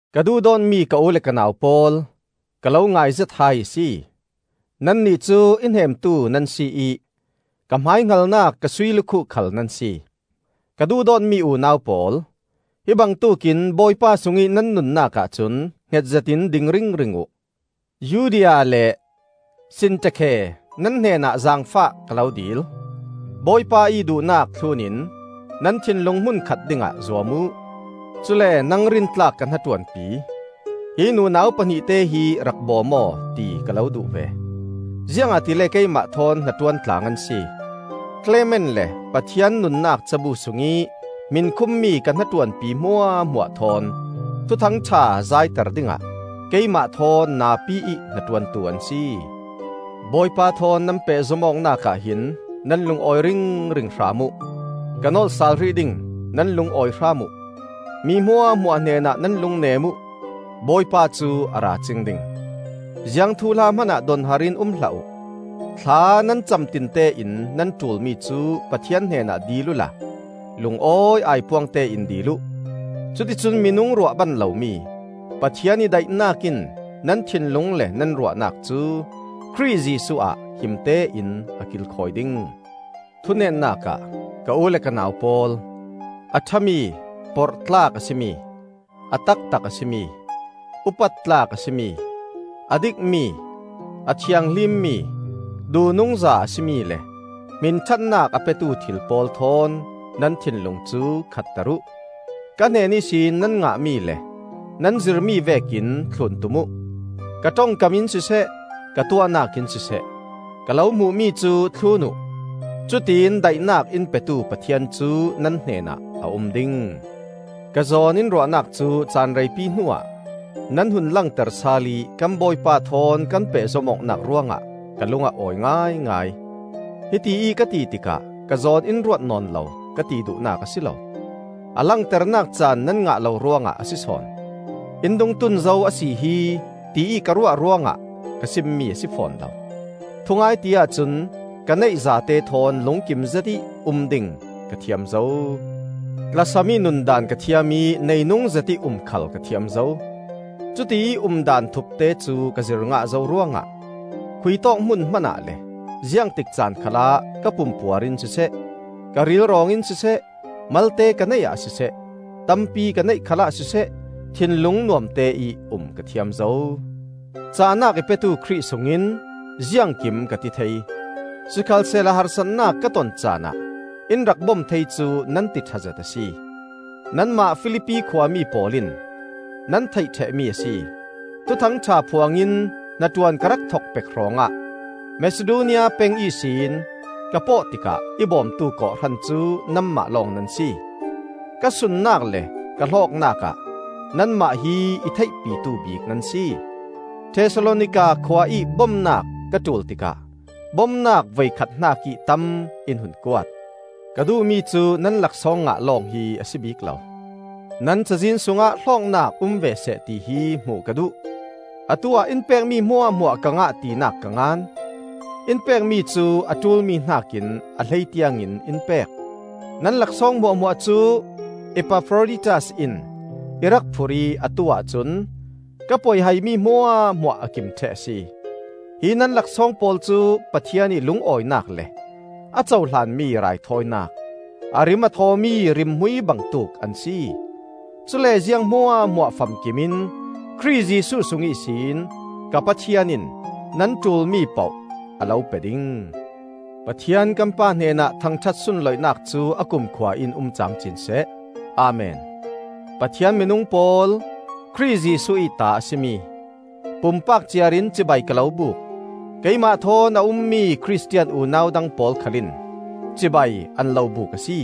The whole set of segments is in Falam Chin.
Ka duhdawtmi ka u le ka nau pawl, ka lo ngaizet hai a si. Nannih cu i hnemtu nan si ih ka hmaihngalnak ka sui lukhuh khal nan si. Ka duhdawtmi unau pawl, hi bangtuk in Bawipa sungih nan nunnak ahcun hnget zetin ding ringring uh. Euodia le Sintekhe, nan hnenah zaangfah ka lo dil: Bawipa ih duhnak thlunin nan thinlung hmunkhat dingah zuam uh. Cule nang rintlak ka hnaṭuanpi, hi nunau pahnihte hi rak bawm aw, ti ka lo duh ve. Ziangahtile keimah thawn hnaṭuan tlang an si; Klement le Pathian nunnak cabu sungih hmin khummi ka hnaṭuanpi hmuahhmuah thawn Thuthang ṭha zaiter dingah keimah thawn napi ih hnaṭuantu an si. Bawipa thawn nan pehzom awknak ah hin nan lung awi ringring hram uh; ka nolh sal hrih ding: nan lung awi hram uh! Mi hmuahhmuah hnenah nan lungnem uh. Bawipa cu a ra cing ding. Ziang thuhla hmanah donhar in um hlah uh; thla nan cam tinte in nan ṭulmi cu Pathian hnenah dil uhla lungawi aipuang tein dil uh. Cuticun minung ruah ban lomi Pathian ih daihnak in nan thinlung le nan ruahnak cu Khrih Jesuh ah himte in a kilkhawi ding. Thunetnak ah, ka u le ka nau pawl, a ṭhami, porhtlak a si mi, a taktak a si mi, upat tlak a si mi, a dikmi, a thianghlimmi, duhnungza a si mi le hminṭhatnak a petu thil pawl thawn nan thinlung cu khatter uh. Ka hnen ihsin nan ngahmi le nan zirmi vekin thlun tum uh. Ka ṭongkam in siseh, ka tuahnak in siseh, ka lo hmuhmi cu thlun uh. Cutiin daihnak in petu Pathian cu nan hnenah a um ding. Ka zawn in ruahnak cu caan reipi hnuah nan hun langter sal ih kan Bawipa thawn kan pehzom awknak ruangah ka lung a awi ngaingai. Hitiih ka ti tikah ka zawn in ruat nawn lo, ka ti duhnak a si lo; a langternak caan nan ngah lo ruangah a si sawn. In dungtun zo a si hi, tiih ka ruah ruangah ka simmi a si fawn lo. Thungai ti ahcun ka neih zatte thawn lungkim zetih um ding ka thiam zo. Tlasam ih nundaan ka thiam ih neinung zetih um khal ka thiam zo. Cutiih umdaan thupte cu ka zir ngah zo ruangah khuitawk hmun hmanah le ziangtik caan khalah ka pumpuar in siseh, ka rilrawng in siseh, malte ka neih ah siseh, tampi ka neih khalah siseh, thinlung nuamte ih um ka thiam zo. Cahnak i petu Khrih sungin ziangkim ka ti thei. Sikhalsehla harsatnak ka ton caanah in rak bom thei cu nan ti ṭha zet a si. Nanmah Filipi khua mi pawl in nan theih ṭhehmi a si. Thuthang ṭha phuangin hnaṭuan ka rak thok pek hrawngah Masidonia peng ihsin ka pawh tikah i bawmtu kawhhran cu nanmah lawng nan si. Ka sunnak le ka hlawknak ah nanmah hi i theihpitu bik nan si. Thesalonika khua ih bomnak ka ṭul tikah bomnak voikhat hnakih tam in hun kuat. Ka duhmi cu nan laksawng ngah lawng hi a si bik lo; nan cazin sungah hlawknak um ve seh ti hi hmuh ka duh. Atuah in pekmi hmuahhmuah ka ngah tinak ka ngan. In pekmi cu a ṭulmi hnakin a hlei tiangin in pek. Nan laksawng hmuahhmuah cu Epafroditas in i rak phurh ih atu ahcun ka poihaimi hmuahhmuah a kim ṭheh a si. Hi nan laksawng pawl cu Pathian ih lungawinak le a cohlanmi raithawinak, a rim a thawmi rimhmui bangtuk an si. Cule ziang hmuahhmuah famkim in Khrih Jesuh sung ihsin ka Pathian in nan ṭulmi poh a lo pe ding. Pathian kan Pa hnenah thangṭhat sunlawinak cu a kumkhua in um camcin seh. Amen. Pathian minung pawl, Khrih Jesuh ih ta a si mi, pumpak ciar in cibai ka lo buk. Keimah thawn a ummi Khristian unau dang pawl khalin cibai an lo buk a si.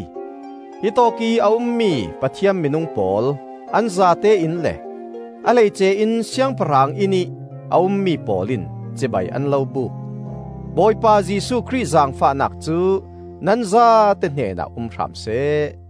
Hi tawkih a ummi Pathian minung pawl an zatein le, a hleice in siangpahrang innih a ummi pawl in cibai an lo buk. Bawipa Jesuh Khrih zaangfahnak cu nan zate hnenah um hram seh.